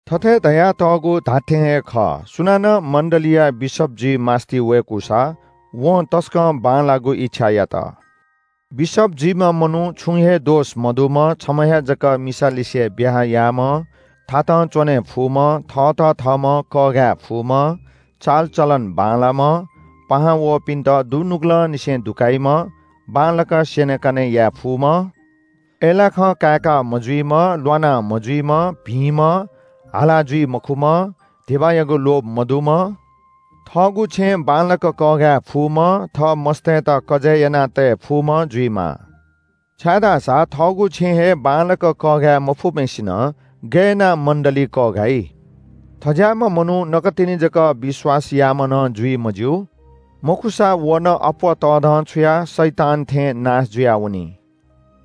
थथे धयातःगु धात्‍थें हे खः – सुनानं मण्‍डलीया बिशप जुइ मास्‍ति वय्‌कूसा, वं तसकं बांलाःगु इच्‍छा यात। बिशप जुइम्‍ह मनू छुं हे दोष मदुम्‍ह, छम्‍ह हे जक मिसालिसे ब्‍याहा याःम्‍ह, थातं च्‍वने फुम्‍ह, थःत थःम्‍हं कःघाये फुम्‍ह, चालचलन बांलाःम्‍ह, पाहां वःपिन्‍त दुनुगलंनिसें दुकाइम्‍ह, बांलाक स्‍यनेकने याये फुम्‍ह, अय्‌लाखं काय्‌का मजुइम्‍ह, ल्‍वाना मजुइम्‍ह, भिंम्‍ह, हाला जुइ मखुम्‍ह, धिबायागु लोभ मदुम्‍ह, थःगु छेँ बांलाक कःघाये फुम्‍ह, थः मस्‍तय्‌त कजय् यानातये फुम्‍ह जुइमाः। छाय्‌धाःसा थःगु छेँ हे बांलाक कःघाये मफुम्‍हय्‌सिनं गय् यानाः मण्‍डली कःघाइ? थज्‍याःम्‍ह मनू नकतिनि जक विश्‍वास याःम्‍ह नं जुइ मज्‍यू। मखुसा व नं अप्‍वः तःधंछुयाः शैतान थें नाश जुयावनी।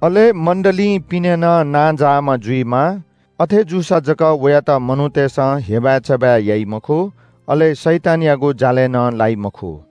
अले मण्‍डलीं पिने नं नांजाःम्‍ह जुइमाः, अथे जूसा जक वयात मनूतय्‌सं हेबाय्‌चबाय् याइ मखु, अले शैतानयागु जालय् नं लाइ मखु।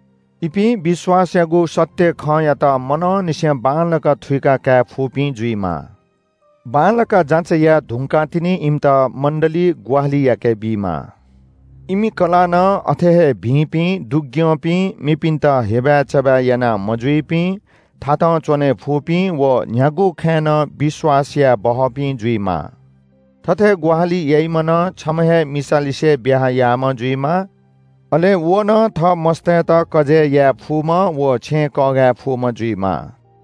इपिं विश्‍वासयागु सत्‍य खँयात मनंनिसें बांलाक थुइका काये फुपिं जुइमाः। बांलाक जाँचय् याये धुंकाः तिनि इमित मण्‍डली ग्‍वाहालि याकेबीमाः। इमि कलाः नं अथे हे भिंपिं, दुग्‍यंपिं, मेपिन्‍त हेबाय्‌चबाय् याना मजुइपिं, थातं च्‍वने फुपिं व न्‍ह्यागु खँय् नं विश्‍वास यायेबहःपिं जुइमाः। थथे ग्‍वाहालि याइम्‍ह नं छम्‍ह हे मिसालिसे ब्‍याहा याःम्‍ह जुइमाः। अले व नं थः मस्‍तय्‌त कजय् याये फुम्‍ह व छेँ कःघाये फुम्‍ह जुइमाः।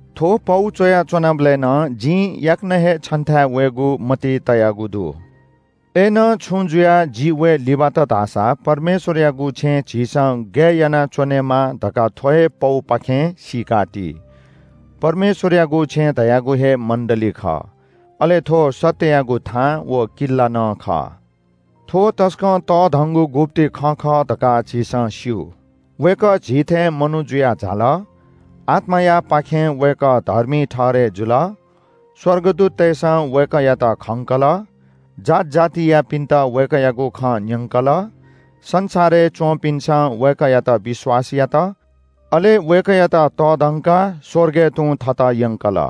थ्‍व पौ च्‍वया च्‍वनाबलय् नं जिं याकनं हे छन्‍थाय् वयेगु मतिइ तयागु दु। अय्‌नं छुं जुयाः जि वये लिबात धाःसा परमेश्‍वरयागु छेँय् झीसं गय् यानाः च्‍वनेमाः धकाः थ्‍व हे पौपाखें सीकाति। परमेश्‍वरयागु छेँ धयागु हे मण्‍डली खः। अले थ्‍व सत्‍ययागु थां व किल्‍ला नं खः। थ्‍व तसकं तःधंगु गुप्‍ति खँ खः धकाः झीसं स्‍यू – वय्‌कः झी थें मनू जुयाः झाल, आत्‍मायापाखें वय्‌कः धर्मी ठहरय् जुल। स्‍वर्गदूततय्‌सं वय्‌कःयात खंकल, जात जातियापिन्‍त वय्‌कःयागु खँ न्‍यंकल, संसारय् च्‍वंपिन्‍सं वय्‌कःयात विश्‍वास यात, अले वय्‌कःयात तःधंकाः स्‍वर्गय् तुं थत यंकल।